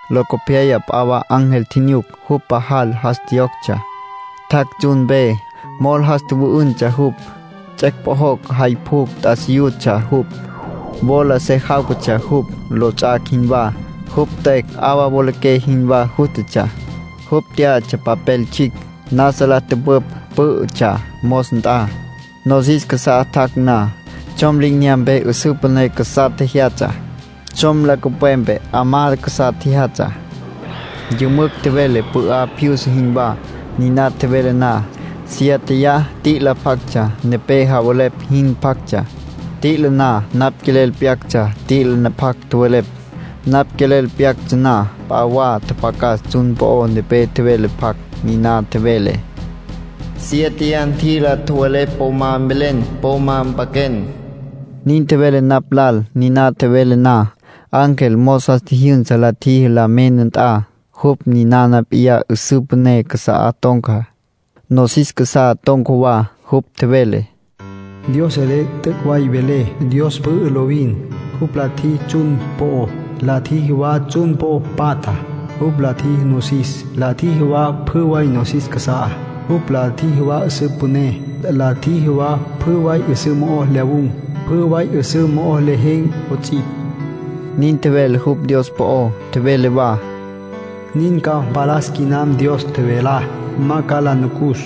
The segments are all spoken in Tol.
Locopyaya p'a wa ángel tjinyuc. Jupj pajal jas tjiyoctsja. Tjac' tsjun mpe. Mol jas tjüwü'üntsja jupj. Tsets' pjojocj jay pjucj t'asiyutsja jupj. Wola se jáwcatsja jupj, lots'ac' jinwá. Jupj tüecj 'awa wolaqué jinwá jústatsja. Jupj tyá'atsja papel tsjicj. Nasa la tüpüpj pǘ'ütsja mos nt'a. Nosis casá tjac' na, tsjom li'inyampe 'üsǘ püné casá tjejyatsja, tsjom nancupwepe 'amá casá tjejyatsja. Yümücj tjevele pü'á pjyusa jinwá. Niná tjevele na, siéteya t'i'ila pjactsja, nepé javelepj jin pjactsja. T'i'ila na, napj quelel pyactsja t'i'ila pjac tjowelepj. Napj quelel pyactsja na, p'a wa tjapjacas tsjun po'ó nepé tjevele pjac. Niná tjevele: “Siéteya t'i'ila tjowelepj po ma mvelen. Po ma mpaquen”, nin tjevele napj lal. Niná tjevele na, ángel mos jas tjijyünsa la tjiji la mena nt'a. Jupj ninana p'iyá 'üsǘ püné casa'á ton̈ca, nosis casá ton̈ca wa. Jupj tjevele: “Dios selé t'üc' way velé. Dios pü'ü lovin. Jupj la tjiji tsjun po'ó, la tjiji wa pjü tsjun po'o patjá. Jupj la tjiji nosis, la tjiji wa pjü way nosis casa'á. Jupj la tjiji wa 'üsǘ püné, la tjiji wa pjü way 'üsǘ mo'ó lyawun̈, pjü way 'üsǘ mo'ó lejen̈ 'ots'ipj”, nin tjevele jupj Dios po'ó. Tjevele wa: “Nin ca mpalas quinam Dios tjevelá. Ma ca la nucus.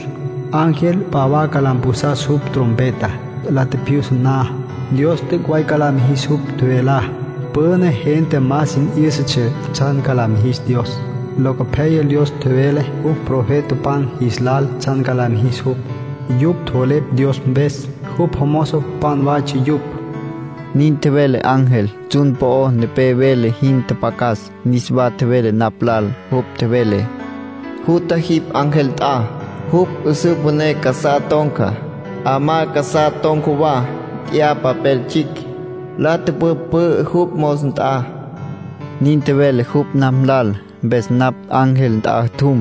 Ángel p'a wa ca la mpjusas jupj trompeta. La tjipjyusa na, Dios t'üc' way ca la mijis jupj tjevelá. Püna gente ma sin 'yǘsatsja tsjan ca la mijis Dios. Locopyaya Dios tjevele jupj profetapan jis lal tsjan la mijis jupj. Yupj tjowelepj Dios mpes. Jupj jomozopan waytsja yupj”, nin tjevele ángel. Tsjun po'o nepé vele jin tjapjacas, niswa tjevele napj lal. Jupj tjevele: “Jutja jipj ángel nt'a, jupj 'üsǘ püné casá ton̈ca, 'amá casá ton̈ca wa. Nt'ya papel tsjicj, la tüpüpj pü'ü jupj mos nt'a”, nin tjevele jupj napj lal. Mpes napj ángel nt'a tjum,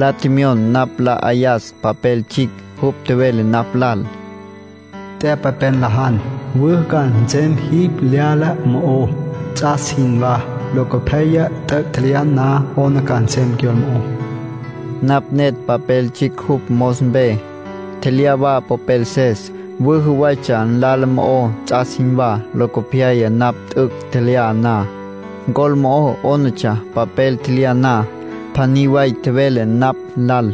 la tjemyon napj nla 'ayas papel tsjicj. Jupj tjevele napj lal: “Nt'ya papel, nlajan. Wüjü ca nsem jipj lyala mo'ó, ts'as jinwá; locopyaya, t'üc' tjelyan na, 'ona ca nsem cyol mo'ó.” Nin tjevele ángel. Napj netj papel tsjicj jupj mos mpe, tjelyá wa popelses. Wüjü waytsja nlala mo'ó ts'as jinwá. Locopyaya, napj t'üc' tjelyá na, ncol mo'ó 'ónatsja. Papel tjelyá na, pjaní way tjevele napj lal: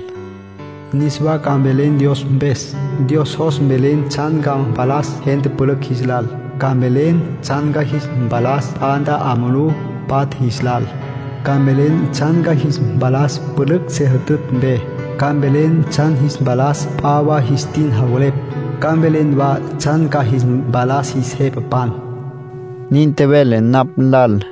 “Niswa ca mvelen Dios mpes. Dios jos mvelen ca tsjan ca jis mpalas gente pülücj jis lal. Ca mvelen tsjan ca jis mpalas p'a nt'a 'a mulú patja jis lal. Ca mvelen tsjan ca jis mpalas pülücj se jütütj mpe. Ca mvelen tsjan ca jis mpalas p'a wa jis tin javelepj. Ca mvelen wa tsjan ca jis mpalas jis jepapan”, nin tjevele napj lal.